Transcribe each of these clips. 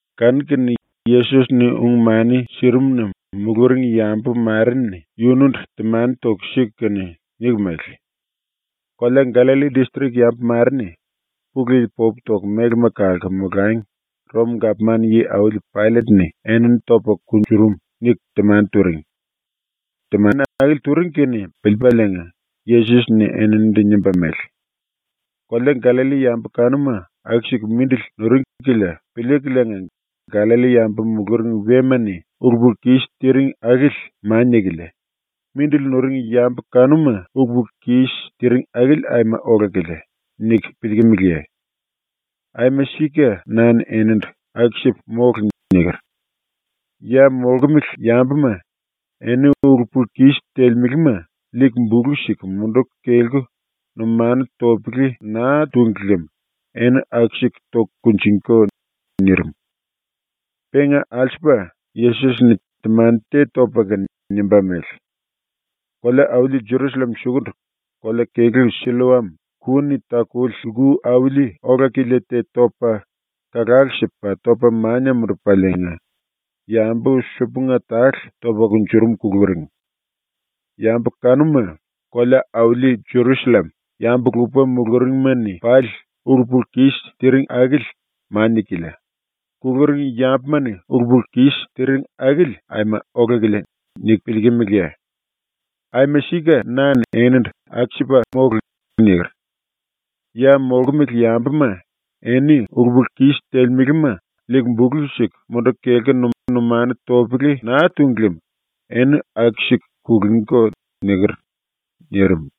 Kanu-kene Yesos-ni ung-mani sirimuna muluring yambu mare-ni yunundu temani toku siku kene niku mele: “Kolea Gallalli distrik yambu mare-ni Pulu Yili popu toku mélema kalku molangi ⸤Rom-gapman yi-auli⸥ Paillet-ni enini topa kunjurum.” niku temani turing. Temani akili turing kene piliipaliinga Yesos-ni eninindu nimba mele: “Kolea Gallalli yambu kanuma aku-siku mindili nuring kilia piliikuliinga ‘Gallalli-yambu muluring wema-ni ulu-pulu-kis tiring akili mania-kilia, mindili nuring yambu kanuma ulu-pulu-kis tiring akili aima ola-kilia.’ niku piliikimiliye? Aima sika na-ni enindu “Aku-sipa mólu.” niker. Ya molkumele yambuma, eni ulu-pulu-kis telemelema liiku bulu siku munduku kelku numanu topele naa túngi lem eni aku-siku toku kunjingíko.” nirim. Penga alsupa Yesos-ni temani te topa kene nimba mele: “Kolea-auli Jerusallem sukundu kolea-kelú Silloam ku-ni takuli lku auli ola-kilia te topa kalalu sipa topa mania mundupaliinga yambu supunga tale topa kunjurum kuluring. Yambu kanuma ‘Kolea-auli Jerusallem yambu-lupa muluringma-ni pali ulu-pulu-kis tiring akili mania-kilia, kuluring yambuma-ni ulu-pulu-kis tiring akili aima ola-kilia.’ niku piliikimiliye? Aima sika na-ni enindu ‘Aku-sipa mólu.’ niker. “Ya molkumele yambuma, eni ulu-pulu-kis telemelema liiku bulu siku munduku kelku numanu topele naa túngi lem eni aku-siku kulungíko.” niker.” nirim.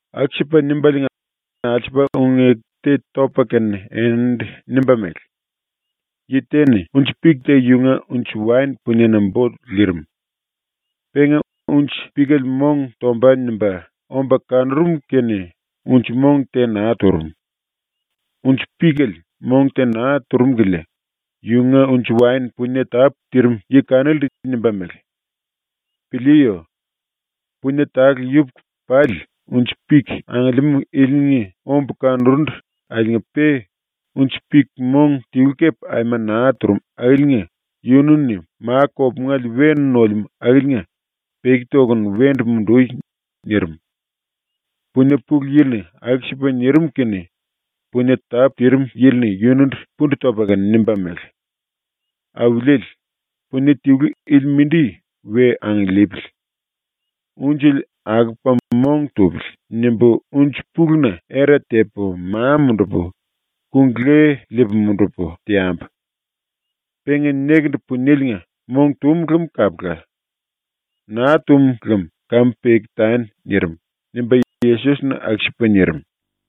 Aku-sipa nimbaliinga alsupa ung-eku te topa kene eninindu nimba mele: “Yi te-ni unji-pik te yunga unji-waen puniena bo lirim. Penga ‘Unji-pikele mong tomba.’ nimba omba kanurum kene unji-mong te naa turum. Unji-pikele mong te naa turum kilia yunga unji-waen punie tápu tirim yi kanilindu nimba mele: “Piliiyo. Punie tale yupuku pali unji-pik angiliimú ilinga ombu kanurundu akiliinga-pe unji-pik mong tilu kepe aima naa turum akiliinga yunu-ni ma-kopungele we nolemú akiliinga peki tokunu wendu mundui.” nirim. Punie pulu yili-ni aku-sipa nirim kene punie tápu tirim yili-ni yunundu pundu topa kene nimba mele: “Auliele, punie tilu ili mindi we angiliipili. ‘Unjele akopa mong tupili.’ nimbu unji-puluna era tepu, ma mundupu, kung-le liipu mundupu, teambu. Penga nekendu punieliinga mong tum lem kapula. Naa tum lem kamu peki tani.” nirim.” ⸤nimba Yesos-ni⸥ aku-sipa nirim.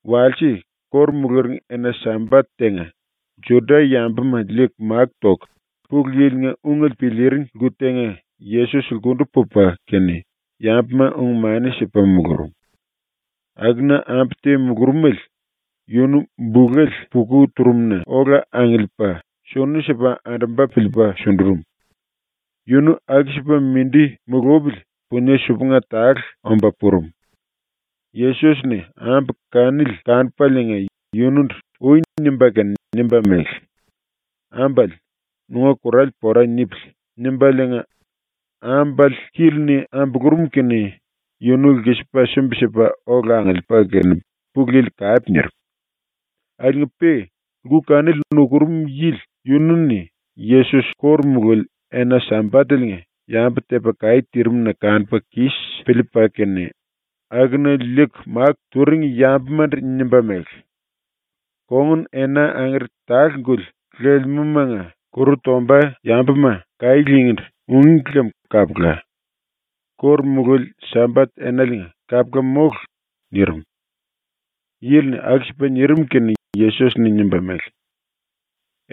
Walse, ⸤kóru muluring⸥ ena-Sambat tenga Juda-yambuma liiku máku toku Pulu Yili-nga ungele piliiring lku tenga Yesos lkundu pupa kene yambuma ung-mani sipa mulurum. Akuna ambu te mulurumele, yunu bulele puka turum-na ola angiliipa sunu sipa andumba piliipa sundurum. Yunu aku-sipa mindi mulupili punie supunga tale omba purum. Yesos-ni ambu kanili kanupaliinga yunundu “Ui.” nimba kene nimba mele: “Ambale, nunga kurale pora nipili.” nimbaliinga ambale kíli-ni ambulurum kene yunu lkisipa sumbi-sipa ola angiliipa kene Pulu Yili kape nirim. Akiliinga-pe lku kanili nukurum yili yunu-ni Yesos ⸤kóru mululi⸥ ena-Sambateliinga yambu tepa kaí tirim-na kanupa kis piliipa kene akuna liiku máku turing yambumandu nimba mele: “Kongun-ena angere tale-guli lelemúmanga ‘Kuru tomba yambuma kaí lingíndu.’ ungí lem kapula. ⸤Kóru mululi⸥ Sambat enaliinga kapula mólu.” nirim. Yili-ni aku-sipa nirim kene Yesos-ni nimba mele: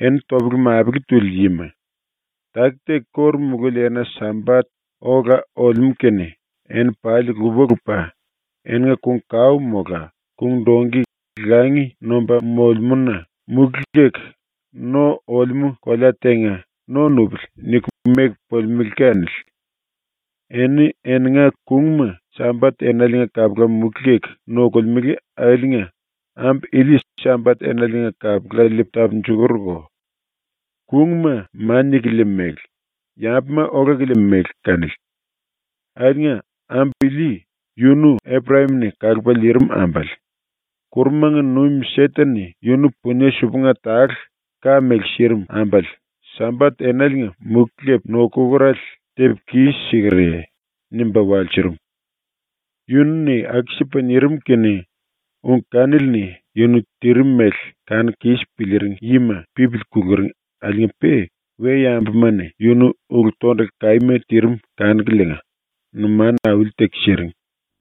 “Eni topele-mapele tuli yima, taki-taki ⸤kóru mululi⸥ ena-Sambat ola olemú kene eni pali lupa-lupa eninga kung-kao mola kung-dongki langi nomba molemúna muki leku no olemú kolea tenga ‘No nupili.’ niku meku pulimelé kanili. Eni eninga kungma Sambat enaliinga kapula muki leku nokolemele akiliinga ambu ili Sambat enaliinga kapula liipu tapunjukurko. Kungma mania-kilia mele, yambuma ola-kilia mele kanili. Akiliinga ambu ili, yunu Eprayam-ni kalupa liirim ambale, ⸤kurumanga nuim⸥ Seten-ni yunu punie ten-et ka mele sirim ambale Sambat enaliinga muki lepu nokukurale tepu kis-sikerye?” nimba walsurum. Yunu-ni aku-sipa nirim kene ung kanili-ni yunu tirim mele kanuku kis piliiring yima pipili kuluring akiliinga-pe we-yambuma-ni yunu ulu-tondulu kaíma tirim kanukuliinga numanu auli-teku siring.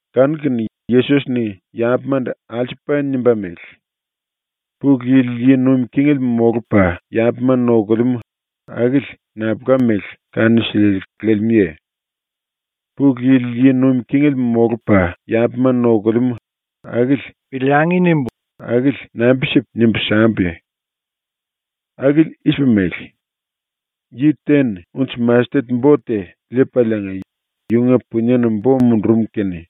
Kanu-kene Yesos-ni ⸤yambumandu⸥ alsupa nimba mele: “Pulu Yili yi nuim kingele molupa yambuma nokulemú, akili nambulka mele kanu-siliele lelemúye? ‘Pulu Yili yi nuim kingele molupa yambuma nokulemú akili piliangi.’ nimbu akili nambi-sipu nimbu sambuye? Akili i-sipa mele: Yi te-ni unji-mastet bo te liipaliinga yunga puniena bo mundurum kene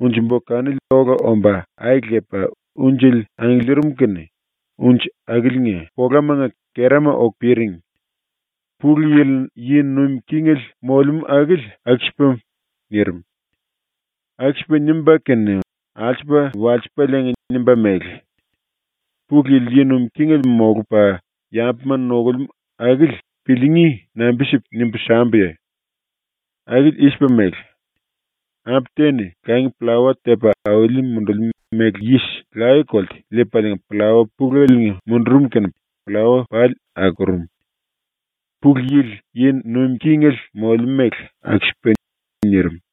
unji-bo kanili ola omba ai lepa unjele angiliirim kene unji akiliinga polamanga kerama oku piring. Pulu Yili yi nuim kingele molemú akili aku-sipa.” nirim. Aku-sipa nimba kene alsupa walsipaliinga nimba mele: “Pulu Yili yi nuim kingele molupa yambuma nokulemú akili piliingí nambi-sipu nimbu sambuye? Akili i-sipa mele: Ambu te-ni langi pllawa tepa auli mundulimú méle yis laye-kolte liipaliinga pllawa puleliinga mundurum kene pllawa pali akurum. Pulu Yili yi nuim kingele molemú mele aku-sipa.” nirim.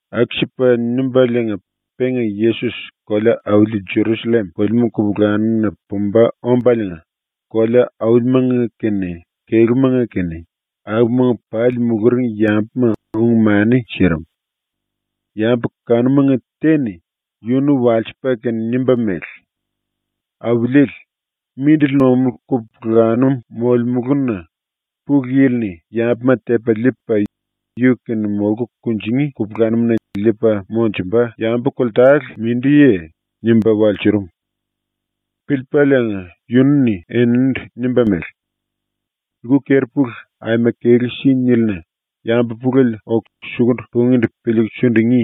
Aku-sipa nimbaliinga penga Yesos kolea-auli Jerusallem pulimú kupulanum-na pumba ombaliinga kolea-aulimanga kene kelúmanga kene, akumanga pali muluring yambuma ung-mani sirim. Yambu kanumanga te-ni yunu walsipa kene nimba mele: “Auliele, mindili nomulú kupulanum molemuluna Pulu Yili-ni yambuma tepa liipa yu-kene molku kunjingí kupulanum-na liipa monjumba yambu koltale mindiye?” nimba walsurum. Piliipaliinga yunu-ni eninindu nimba mele: “Lku keri-pulu aima kelú si nílina yambu pulele oku sukundu pungíndu piliiku sundungí.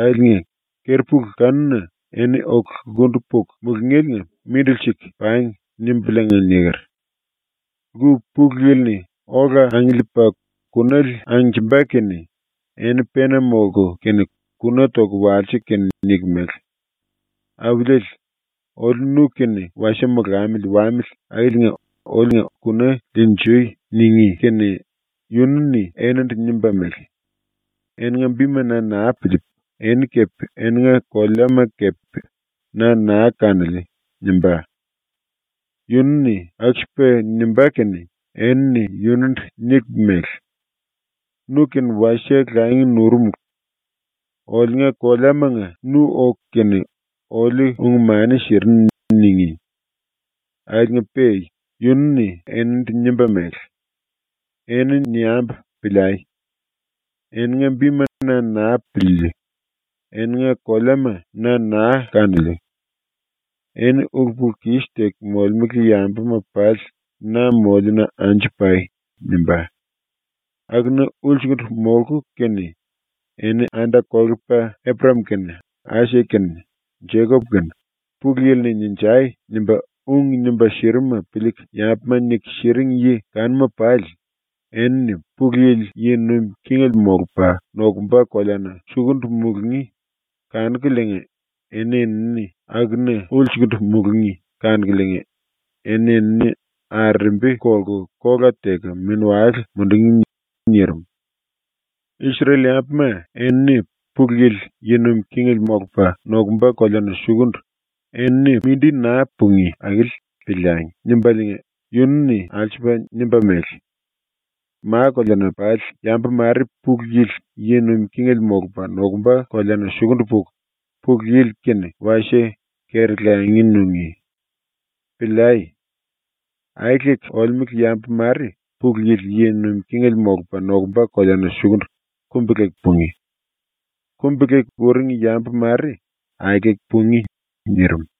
Akiliinga ‘Keri-pulu kanuna eni oku lkundu puku mulungéliinga mindili siku pangi.’ nimbuliinga niker. Lku pulu yili-ni ola angiliipa kunale angnjimba kene eni pena molku kene kuna toku walsiku kene niku mele: “Auliele, oliu nu-kene wasie molamili wamili akiliinga oliunga kuna liinjui.” ningí kene yunu-ni eninindu nimba mele: “Eninga bima na naa piliipu eni kepe eninga koleama kepe na naa kanoliu.” nimbá. “Yunu-ni aku-sipa nimbá kene enini yunundu niku mele: “Nu-kene wasie langi nurumulu. Oliunga koleamanga nu oku kene oliu ung-mani sirinu.” ningí. “Akiliinga-pe yunu-ni eninindu nimba mele: “Eni niambu piliai. Eninga bima na naa piliiliu, eninga koleama na naa kanoliu. Eni ulu-pulu-kis teku molemele yambuma pali na moliuna anju pai.” nimbá. Akuna ulsukundu molku kene eni ⸤anda-kolepa⸥ Eprayam kene, Aisak kene, Jekop kene, Pulu Yili-ni “Ninjai!” nimba ung nimba sirimuma piliiku yambuma niku siring yi kanuma pali, enini Pulu Yili yi nuim kingele molupa nokumba koleana sukundu mulungí kanukuliinga eni-enini akuna ulsukundu mulungí kanukuliinga eni-enini arerembi kolku kola teku mini-wale mundungí.” nirim. ⸤Isrel-yambuma enini Pulu Yili yi nuim kingele molupa nokumba koleana sukundu enini mindi naa pungí akili ‘Piliangi.’ nimbaliinga⸥ yunu-ni alsupa nimba mele: “Ma-koleana pali yambu mare Pulu Yili yi nuim kingele molupa nokumba koleana sukundu puku Pulu Yili-kene wasie keri-langi nungí. Piliai. Aeleku olemele yambu mare Pulu Yili yi nuim kingele molupa nokumba koleana sukundu kumbi-leku pungí. Kumbi-leku uring yambu mare aeleku pungí.” nirim.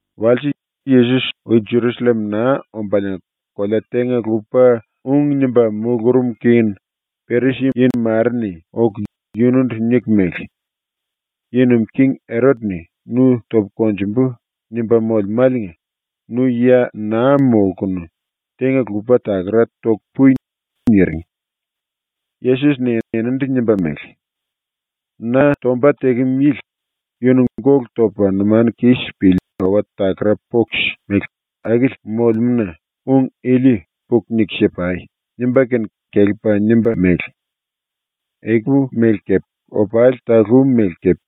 Walse, Yesos ui Jerusallem naa ombaliinga kolea tenga-lupa ung nimba mulurum kene Perisi-yi mare-ni oku yunundu niku mele: “⸤Yi nuim king⸥ Erot-ni ‘Nu topu konjumbu.’ nimba molemáliinga nu ya naa molkunu tenga-lupa takara toku pui.” niring. Yesos-ni eninindu nimba mele: “Na tomba tekem yili, yunu gólu topa numanu kis pili owa-takara poks mele akili molemúna ung ili puku niku si-pai.” nimba kene kelepa nimba mele: “Ekupu mele kepe opali talú mele kepe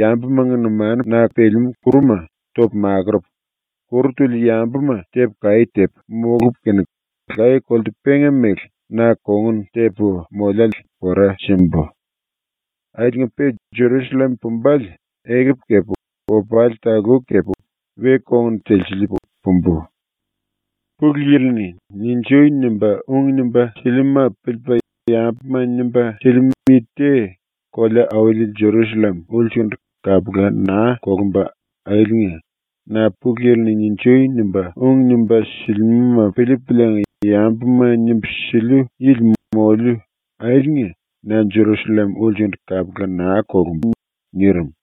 yambumanga numanuna pelemú kuruma topu makurupu, kuru tuli yambuma tepu kaí tepu, molupu kene laye-kolte penga mele na kongun tepu moliále pora simbu. Akiliinga-pe Jerusallem pumbale ekupu kepe opali talú kepe we-kongun telsiliipu pumbu. Pulu Yili-ni “Ninjui!” nimba ung nimba silimúma piliipa yambuma nimba silimú yi te kolea-auli Jerusallem ulsukundu kapula naa kolumba akiliinga ⸤na Pulu Yili-ni “Ninjui!” nimba ung nimba silimúma piliipuliinga yambuma nimbu siliu yili moliu akiliinga⸥ na Jerusallem ulsukundu kapula naa kolumbu.” ⸤nirim.⸥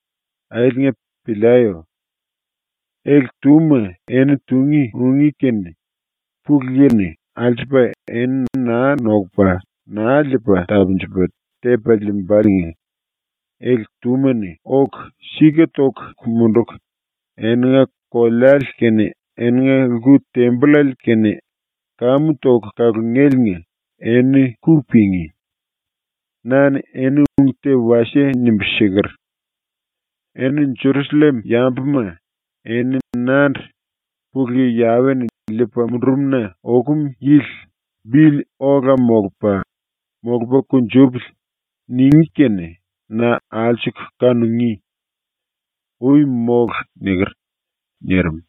Akiliinga piliayo. ⸤Ele-túma eni tungí ungí kene Pulu Yili-ni alsupa eni naa nokupa naa liipa tapunjupa tepa liimbaliinga⸥ ele-túma-ni oku sika toku munduku eninga koleale kene eninga lku-tembollale kene kamu toku kalungéliinga eni ku pingí. Na-ni eni ung te wasie nimbu siker: “Eni Jerusallem-yambuma, eni nandu “Pulu Yi Yawe-ni liipa mundurum-na okum yili bili ola molupa, molupa kunjupili.” ningí kene na alsuku kanungí. Ui mólu.” niker.” nirim.